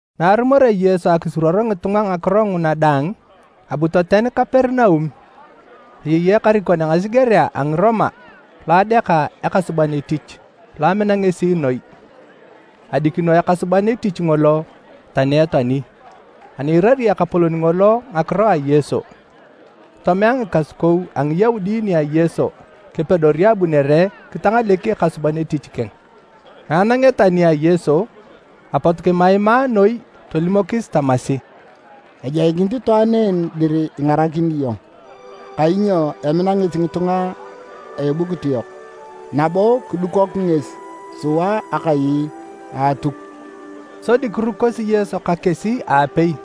Na arumorea Yesu akisuruor ngitunga ngakiro nguna daang, abu toten Kaperinaum. Ayei ekarikon a ngasigerea a Ngiroma lo adeaka ekasuban etich lo amina ngesi noi. Adikino ekasuban etich ngolo tani etoani. Ani iirari ekapolon ngolo ngakiro a Yesu, tomea ngikasukou a Ngiyaudi nia Yesu kepedori abunere kitangalek ekasuban etich keng. Na ananguneta nia Yesu, apot kimaimaa noi tolimokis tamasi, “Ejoikinit itwaan en dir ingarakini iyong, kainyo emina ngesi ngitunga a ebukut yok nabo kidukok ngesi sua akai a Atuk.” Sodi kirukosi Yesu ka kesi aapei.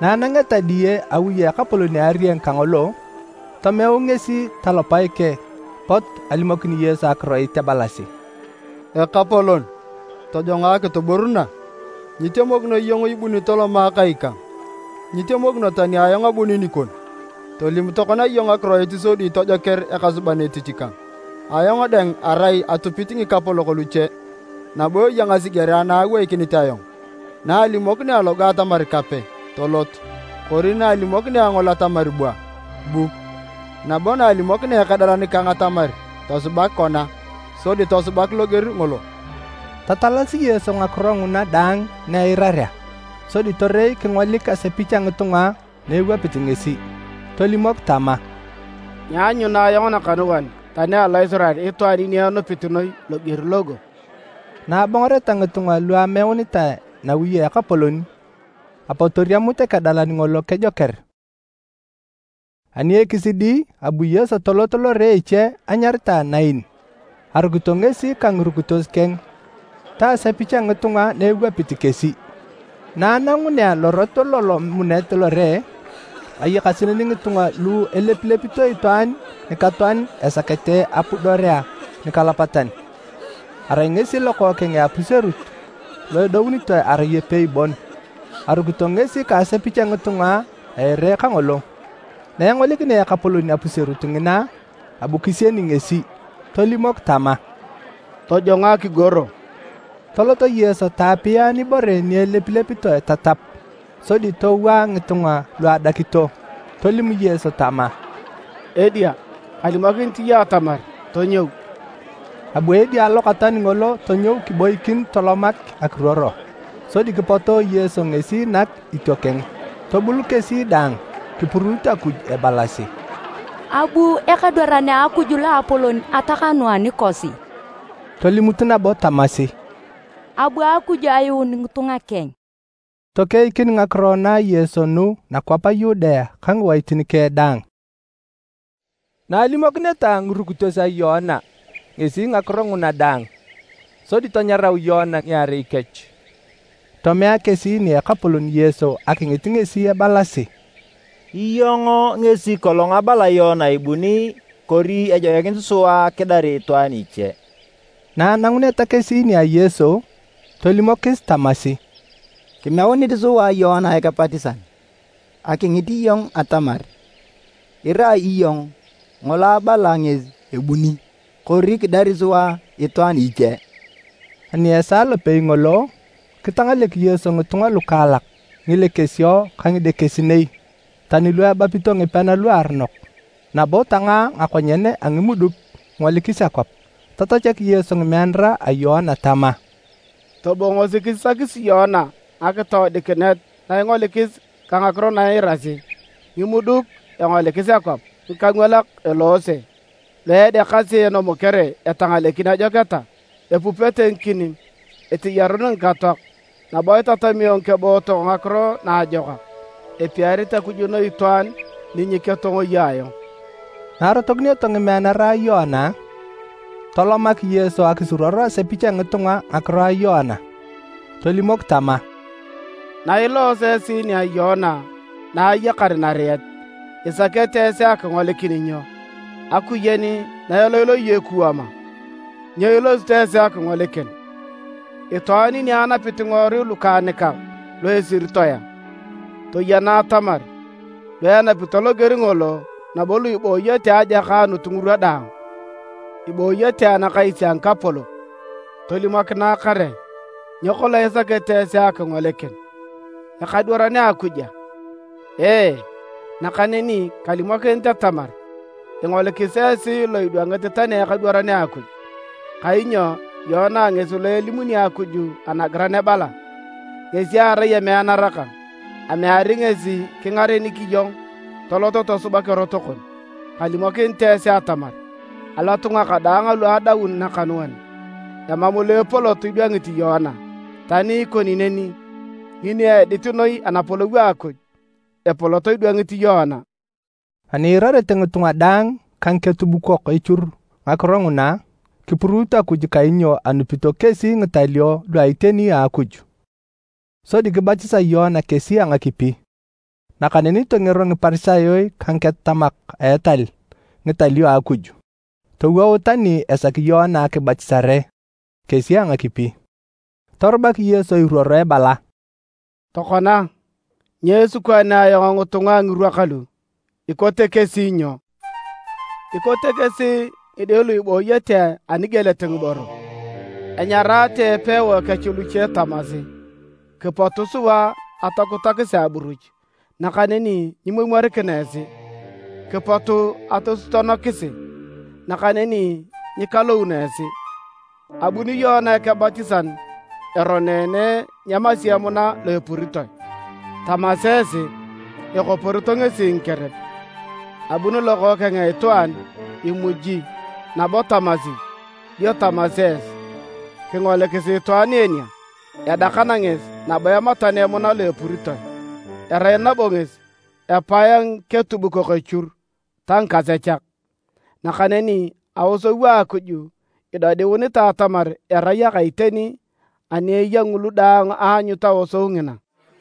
Na anangeta diye awi a ekapolon a arieng kangolo, tomeu ngesi talopae keng pot alimokin Yesu akiroit ebalasi, “Ekapolon, tojongo akituburuna. Nyitemokino iyong ibuni tolom kai kang, nyitemokino tani ayong abuni nikon. Tolim tokona iyong akiroit sodi tojoker ekasuban etich kang. Ayong dang arai lo atupit ngikapolok luche, nabo eya ngasigerea na aweikinit ayong. Na alimokinea logo atamar, ‘Kape!’ tolot. Kori na alimokinea ngol atamar, ‘Bua!’ bu. Nabo na alimokinea ekedalan kang atamar, ‘Tosubak kona!’ sodi tosubak loger ngolo.” Tatalasi Yesu ngakiro nguna daang na eirarea, sodi torei kingolik asepich a ngitunga na ewapit ngesi, tolimok tama, “Nyeanyuna ayong nakanuan tani alo Isirael itwaan ni enupit noi loger logo!” Na abongoreta ngitunga lu ameunitae nawi a ekapolon, apot toriamut ekedalan ngolo kejoker. Ani ekisidi, abu Yesu tolot lore eche anyaritae Nain, arukito ngesi ka ngirukitos keng ta asepich a ngitunga na ewapit kesi. Na anangunea lorot lolomunet lore, ayakasi neni ngitunga lu elepilepito itwaan nikatoan esakete apudorea nikalapatan. Arai ngesi lokookeng a apuserut lo edounitoe erai epei bon. Arukito ngesi ka asepich a ngitunga a ere kangolo. Na engolikinea Ekapolon apuserut ngina, abu kisieni ngesi, tolimok tama, “Tojongo akigoro.” Tolot Yesu taapia nibore ni elepilepitoe tatap, sodi towaa ngitunga lu adakito. Tolim Yesu tama, “Edia, kalimokinit iyong atamar tonyou!” Abu edia lokatoan ngolo tonyou kiboikin tolomak akiruoro, sodi kipoto Yesu ngesi nak itiokeng. Tobul kesi daang, kipuruut Akuj ebalasi, “Abu ekadwaran a Akuj loapolon atakanuu anikosi!” Tolimut nabo tamasi, “Abu Akuj ayuun ngitunga keng!” Tokeikin ngakiro na a Yesu nugu nakwap a Yudea ka ngiwaitin keng daang. Na alimokineta ngirukitos a Yoana ngesi ngakiro nguna daang, sodi tanyarau Yoana ngiarei kech tomea kesi nia Ekapolon Yesu akingit ngesi ebalasi, “Iyong ngesi kolong abala Yoana ibuni, kori ejoikinit sua kidari itwaan iche?” Na ananguneta kesi nia Yesu, tolimokis tamasi, “Kimeunit sua Yoana Ekebatisan akingit iyong atamar irai iyong ngolo abala ngesi ebuni, kori kidari sua itwaan iche?” Ani esaa lopei ngolo, kitangalek Yesu ngitunga lukaalak ngilekesio ka ngidekesinei, tani lu ebapito ngipean luaronok, nabo tangaa ngakonyen a ngimuduk kingolikis akwap. Tatachak Yesu ngimeanara a Yoana tama, “Tobongosi kisisakisi Yoana ngakitoodikinet na ingolikis ka ngakiro na iirasi. Ngimuduk engolikis akwap, ngikangwalak eloose, lu edeakasi enomokere etangalekin ajoketa, epupete ngikinim, eteyarun ngikatoak, nabo itatamio ngikebootok Ngakiro Naajokak. Epiarit Akuj noi itwaan ni nyeketongoyae ayong!” Na arotokinioto ngimeanara a Yoana, tolomak Yesu akisuruor asepich a ngitunga ngakiro a Yoana. Tolimok tama: “Nailooso esi nia Yoana na ayakar nariet, isakete esi akingolikin nyo? Akuyen na eloiloi ekuwam a? Nyo ilosito esi akingolikin? Itwaan ni anapit ngiworui lukaanikak lu esiritoe a? Toyena atamar lu enapito loger ngolo nabo lu ibooyete ejakaanito ngirwa daang ibooyete anakais a ngikapolok! Tolimokinae kare, nyo kolong isakete esi akingolikin? Ekadwaran a Akuj a? Ee, nakaneni kalimokinit atamar ingolikis esi lo idwangit tani ekadwaran a Akuj. Kainyo Yoana ngesi lo elimunit Akuj anagiran ebala: ‘Ngesi erai emeanara kang, ameari ngesi kingarenik iyong tolot tosubak erot kon.’” Kalimokinit esi atamar, “Alotunga kadaang alu edoun nakanuan, emam lo epolot idwangit Yoana. Tani ikoni neni, ngini edit noi Anapolou a Akuj, epolot idwangit Yoana.” Ani iirarete ngitunga daang ka ngiketubukok echur ngakiro nguna, kipuruut Akuj kainyo anupito kesi ngitalio lu a iteni a Akuj, sodi kibatisa Yoana kesi a ngakipi. Nakaneni tongero Ngiparisayo ka ngiketatamak a etal ngitalio a Akuj, towout tani esaki Yoana akibatisare kesi a ngakipi. Torubak Yesu iruoro ebala, “Tokona, nyo esikwaanea ayong ngitunga a ngirwa kalu? Ikote kesi nyo? Ikote kesi ngide lu ibooyete anigielet ngiboro. Enyaraate epewae kech luche tamasi: ‘Kipot sua atokutakisi aburuch, nakaneni nyimomwarikina esi! Kipot atosutuonokisi, nakaneni nyikalouno esi!’ Abuni Yoana Ekebatisan eroneene nyeemasi emuna lo epuritoe, tamasi esi, ‘Ekoporito ngesi ngikerep!’ Abuni Lokookeng a Itwaan imuji nabo tamasi dio tamasi esi, ‘Kingolikisi itwaan en a! Edakana ngesi nabo ematana emuna lo epuritoe, erai nabo ngesi epae a ngiketubukok echur ta ngikasechak!’ Nakaneni aosou a Akuj idodiunitae atamar erai aka iteni ani eya ngulu daang aanyut aosou ngina.”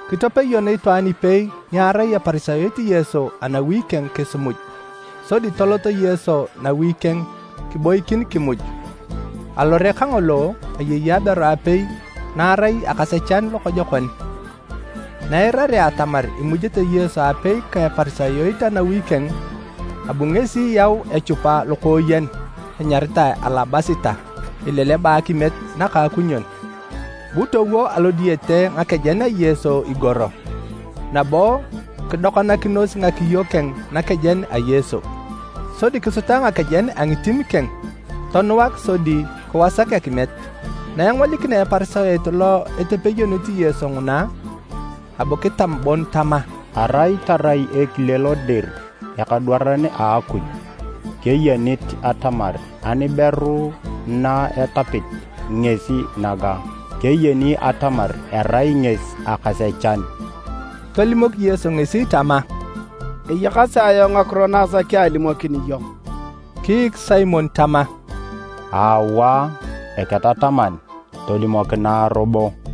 Kitepeyon itwaan ipei ni arai Eparisayot Yesu anawi keng kisimuj. Sodi tolot Yesu nawi keng kiboikin kimuj. Alore kangolo, ayei aberu apei na arai akasechan lokojokon. Na eirarea atamar imujete Yesu aapei ka Eparisayot anawi keng, abu ngesi yau echupa lokooyen enyaritae alabasita, ileleba akimiet nakaakunyon. Bu towo alodiyete ngakejen a Yesu igoro, nabo kidokanakinos ngakiyo keng nakejen a Yesu. Sodi kisuta ngakejen a ngitim keng tonuak sodi kiwasak akimiet. Na engolikinea Eparisayot lo etepeyonit Yesu nguna, abu kitam bon tama, “Arai tarai ekile lo dir ekadwaran a Akuj, keyenit atamar aniberu na etapit ngesi naga, keyeni atamar erai ngesi akasechan!” Tolimok Yesu ngesi tama, “Eyakasi ayong ngakiro na asaki alimokin iyong.” Kiik Simon tama, “Awaa, Eketataman, tolimokinae robo.”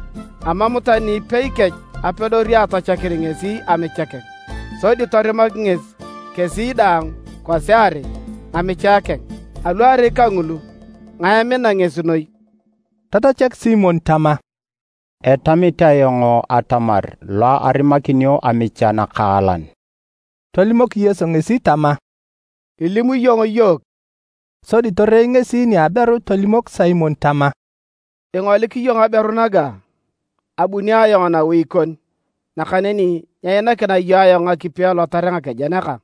Amam tani ipei ni apedori atachakin ngesi amicha keng, sodi torimak ngesi kesi daang kwasiarei ngamichae keng. Aluarei kangulu, ngae emina ngesi noi?” Tatachak Simon tama, “Etamit ayong atamar lo arimakinio amicha nakaalan.” Tolimok Yesu ngesi tama, “Ilim iyong iyook.” Sodi torei ngesi nia aberu tolimok Simon tama, “Ingolik iyong aberu naga? Abuni ayong nawi kon, nakaneni nyeinakina iyong ayong ngakipi elotarea ngakejen kang,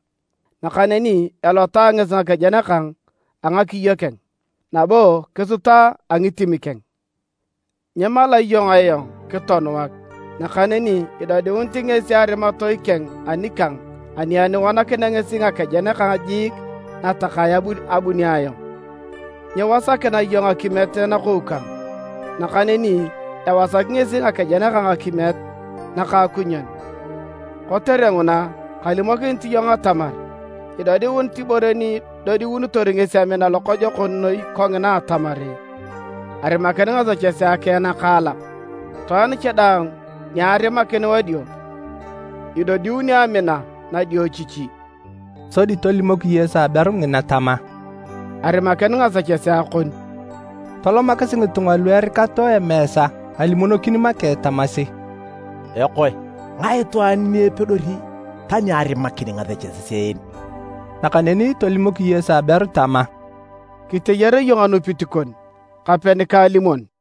nakaneni elota ngesi ngakejen kang a ngakiyo keng, nabo kisuta a ngitim keng. Nyimala iyong ayong kitonuak, nakaneni idodiunit ngesi arimatoi keng anikang ani enuanakinea ngesi ngakejen kang jiik natakae abunio ayong. Nyiwasakina iyong akimiet nakou kang, nakaneni ewasak ngesi ngakejen kang akimiet nakaakunyon. Kotere nguna kalimokinit iyong atamar, idodiunit ibore ni idodiunitor ngesi amina lokojokon noi kongina atamar arimakin ngasechesea keng nakaalak. Itwaan cha daang ni arimakin wadio, idodiuni amina nadiochichi.” Sodi tolimok Yesu aberu ngina tama, “Arimakin ngasechesea kon.” Tolomakis ngitunga lu erikato emeesa alimonokin make tamasi, “Ekoe, ngae itwaan ni epedori tani arimakin ngasechesea en?” Nakaneni tolimok Yesu aberu tama, “Kiteyar iyong anupit kon, kape nikaalimon.”